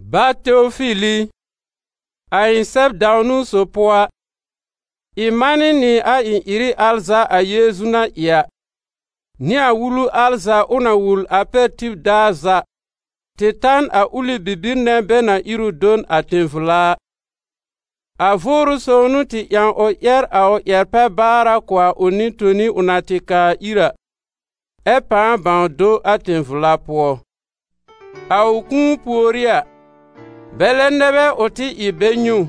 Bá Teofil i, A ɩ̃ sɛb dãw-niwn sob pʋɔ a, ɩ̃ manɩ nɩ a ɩ-ɩrɩ al za a Yeezu na ɩ a, nɩ a wulu al za ʋ na wul a pɛr tib daar za tɩ ta n a ʋlɩ bibir nɛ̃ bɛ na ír ʋ do n a tẽ-vla a. A Vʋʋrʋ Sõw n'ʋ tɩ ƴãw ʋ ƴɛr a ʋ ƴɛr-pɛ-baara kʋ̀ a ʋ nɩ-toni ʋ na tɩ kaa ir a, ɛ pãa bãw do a tẽ-vla pʋɔ. A ʋ kũu pùorí a, bɛlɛ nɛ bɛ ʋ tɩ ɩ bɛ nyɛ̃ ʋ,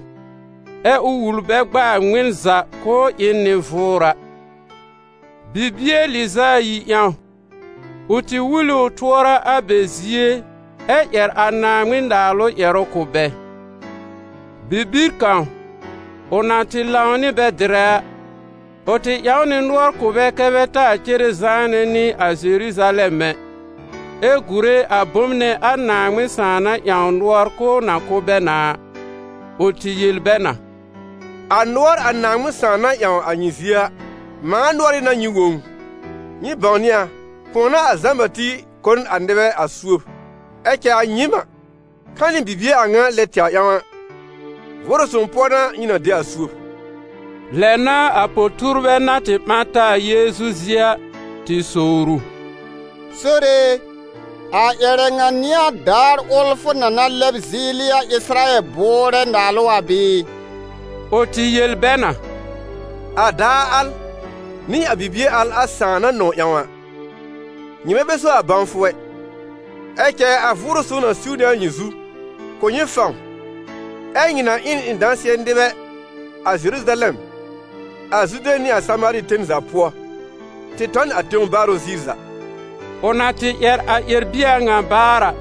ɛ ʋ wul bɛ gb'a a ŋmɩn za k'ʋʋ ɩ n nɩ-vʋʋra: bibie lɩz'a ayi ƴãw, ʋ tɩ wul ɩ ʋ tʋɔra a bɛ zie ɛ ƴɛr a Naaŋmɩn-Naalʋ ƴɛrʋ kʋ̀ bɛ. Bibir kãw, ʋ na tɩ lãw nɩ bɛ dɩrɛ a, ʋ tɩ ƴãw nɩ nʋɔr kʋ̀ bɛ kɛ́ bɛ taa cere zãanɛ nɩ a Zeruzalɛm ɛ, ɛ gùre a bom nɛ a Naaŋmɩn Sãà na ƴãw nʋɔr k'ʋʋ na kʋ̀ bɛ na a. Ʋ tɩ yel bɛ na: «A nʋɔr a Naaŋmɩn Sãà na ƴãw a nyɩ zie a, mãa nʋɔrɩ́ n'a nyɩ wõ ʋ. Nyɩ bãwnɩ a, kʋ̃ɔ n'a a Zã-Bati kʋ̀ n a nɩbɛ a suob, ɛ cɛ a nyɩɩm a, ka nɩ bibie a ŋa lɛ tɛwr ƴãw a, Vʋʋrʋ Sõw pʋɔ n'a nyɩ na de a suob.» Lɛ n'a a po-tuurbɛ na tɩ ɓã taa a Yeezu zie a, tɩ sowr ʋ: « Sore e, a ƴɛrɛ ŋa n'ɩ a daar ʋl fʋ na na lɛb zɩɩlɩ a Ɩsɩrayɛl bʋʋrɛ naalʋ a bɩɩ?» Ʋ tɩ yel bɛ na: «A daar al, nɩ a bibie al a Sãà na nɔ̃w ƴãw a, nyɩmɛ bɛ so a bãwfʋ ɛ. Ɛ cɛ a Vʋʋrʋ Sõw na siw nɩ a nyɩ zu, kʋ̀ nyɩ fãw, ɛ́ nyɩ na ɩ n ɩ̃ dãsɩ̃ɛ nɩbɛ a Zeruzalɛm, a Zude nɩ a Samaari ten za pʋɔ, tɩ tɔ n a tẽw baarʋ ziir za.» Ʋ na tɩ ƴɛr a ƴɛr-bie a ŋa baar a,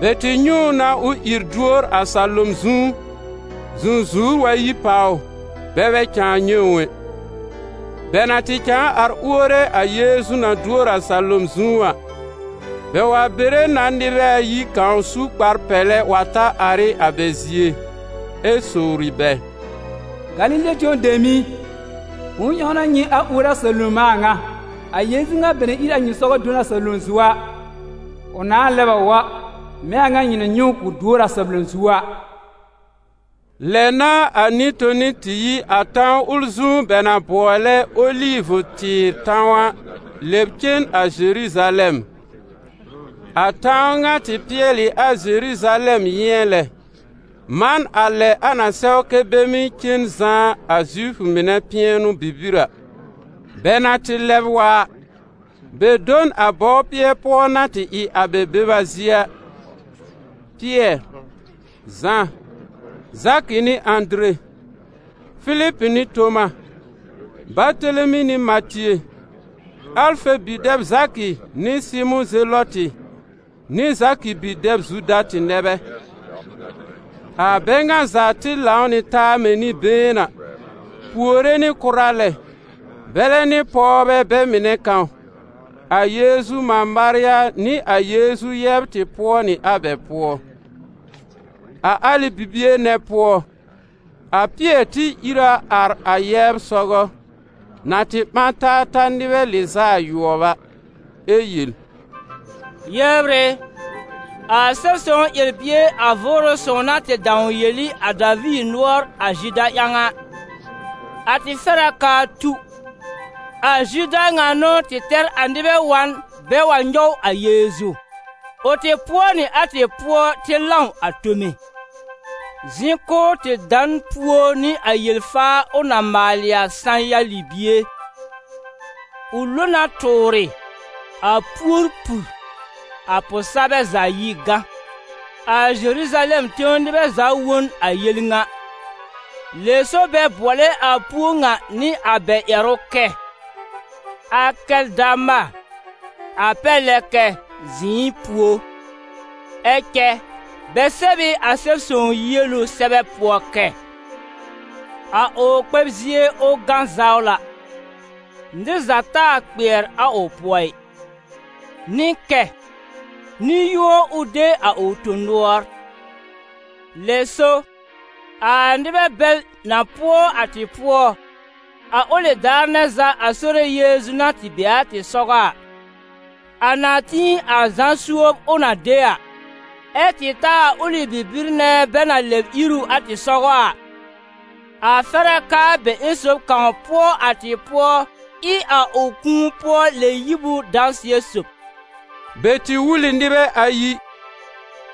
bɛ tɩ nyɛ̃ ʋ na ʋ ìr duor a salom zu, zũzuwr wa yi pàw ʋ, bɛ bɛ cãa nyɛ̃ ʋ ɛ. Bɛ na tɩ cãa ar uore a Yeezu na duor a salom zu a, bɛ wa bere na nɩbɛ ayi kãw su kpar-pɛlɛ wa ta ar ɩ a bɛ zie, ɛ sowri bɛ: «Galile tẽw dem i, bʋ̃nʋ ƴãw n'a nyɩ ar uore a salom a a ŋa? A Yeezu ŋa bɛ na ír a nyɩ sɔgɔ do n a salom zu a, ʋ nãa lɛb a wa, mɛ̃ a a ŋa nyɩ na nyɛ̃ ʋ k'ʋ duor a salom zu a.» Lɛ n'a a nɩ-toni tɩ yi a tãw ʋl zu bɛ na bʋɔlɛ Olivʋ-tɩɩr tãw a lɛb cen a Zeruzalɛm; a tãw ŋa tɩ pɩɛl ɩ a Zeruzalɛm yɩ̃ɛ lɛ, man a lɛ a na sɛw kɛ́ bɛ mɩ́ cen zãá a Zifʋ mɩnɛ pɩɛnʋ-bibir a. Bɛ na tɩ lɛb wa a, bɛ do n a bɔwpɩɛ pʋɔ na tɩ ɩ a bɛ beba zie a. Pɩɛr, Zã, Zakɩ nɩ Ãdere, Filib nɩ Toma, Batelemi nɩ Matie, Alfe bi-dɛb Zakɩ nɩ Sɩmʋ̃ Zelɔtɩ nɩ Zakɩ bi-dɛb Zuda tɩ nɛ bɛ. A bɛ ŋa za tɩ lãw nɩ taa mɛ̃ nɩ-been a, puore nɩ kʋra lɛ, bɛlɛ nɩ pɔwbɛ bɛ mɩnɛ kãw, a Yeezu mã Marya nɩ a Yeezu yɛbr tɩ pʋɔ nɩ a bɛ pʋɔ. A alɩ bibie nɛ pʋɔ, a Pɩɛr tɩ ìr a ar a yɛbr sɔgɔ, na tɩ ɓã taa ta nɩbɛ lɩz'a ayʋɔb a, ɛ yel: «Yɛbr ɩ, a Sɛb-sõw ƴɛr-bie a Vʋʋrʋ Sõw na tɩ dãw yel ɩ a Daviir nʋɔr a Zuda ƴãw a, a tɩ fɛr a k'aa tu; a Zuda ŋa n'ʋ tɩ tɛr a nɩbɛ wa n bɛ wa nyɔw a Yeezu. Ʋ tɩ pʋɔ nɩ a tɩ pʋɔ tɩ lãw a tome. Zɩ̃ k'ʋʋ tɩ da n puo nɩ a yel-faa ʋ na maalɩ a sã-ya libie: ʋ lo na tʋʋrɩ, a puór pur, a pʋ-sabɛ za yi gã. A Zeruzalɛm tẽw nɩbɛ za wõ n a yel ŋa. Lɛ so bɛ bʋɔlɛ a puó ŋa nɩ a bɛ ƴɛrʋ kɛ: ‹Akɛldama› a pɛr lɛ kɛ: ‹zɩ̃ɩ puó.› Ɛ cɛ bɛ sɛb ɩ a Sɛb-sõw yielu sɛbɛ pʋɔ kɛ: ‹A ʋ kpɛb zie, ʋ gã zawla, nɩr za taa kpɩɛr a ʋ pʋɔ ɩ.› Nɩ kɛ: ‹Nɩ-yũo, ʋ de a ʋ tõ-nʋɔr.› Lɛ so, a nɩbɛ bɛl na pʋɔ a tɩ pʋɔ, a ʋlɩ daar nɛ za a Sore Yeezu na tɩ be a tɩ sɔgɔ a, a na tĩ a Zã suob ʋ na de a, ɛ tɩ ta a ʋlɩ bibir nɛ bɛ na lɛb ír ʋ a tɩ sɔgɔ a, a fɛr a k'aa bɛ ƴẽn sob kãw pʋɔ a tɩ pʋɔ ɩ a ʋ kũu-pʋɔ-lɛ-yib dãsɩɛ sob.» Bɛ tɩ wul ɩ nɩbɛ ayi: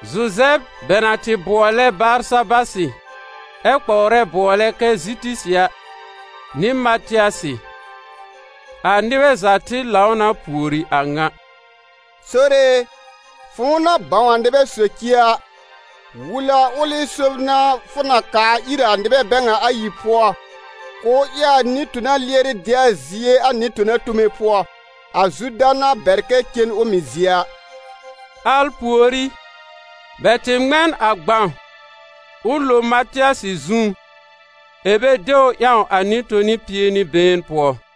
Zuzɛb, bɛ na tɩ bʋɔlɛ Barsabasɩ, ɛ́ kpɔwrɛ bʋɔlɛ kɛ Zitisɩ a, nɩ Matɩasɩ. A nɩbɛ za tɩ lãw na pùori a ŋa: «Sore e, fʋ̃ʋ na bãw a nɩbɛ socie a, wul a ʋlɩ sob fʋ na kaa ir a nɩbɛ bɛ ŋa ayi pʋɔ, k'ʋʋ ɩ a nɩ-tona lɩɛrɩ de a zie a nɩ-tona tome pʋɔ, a Zuda na bɛr kɛ cen a ʋ mɩ̀ zie a.» Al pùorí, bɛ tɩ ŋmɛ n a gbãw, ʋ lo Matɩasɩ zu, ɛ̀ bɛ de ʋ ƴãw a nɩ-toni pie nɩ been pʋɔ.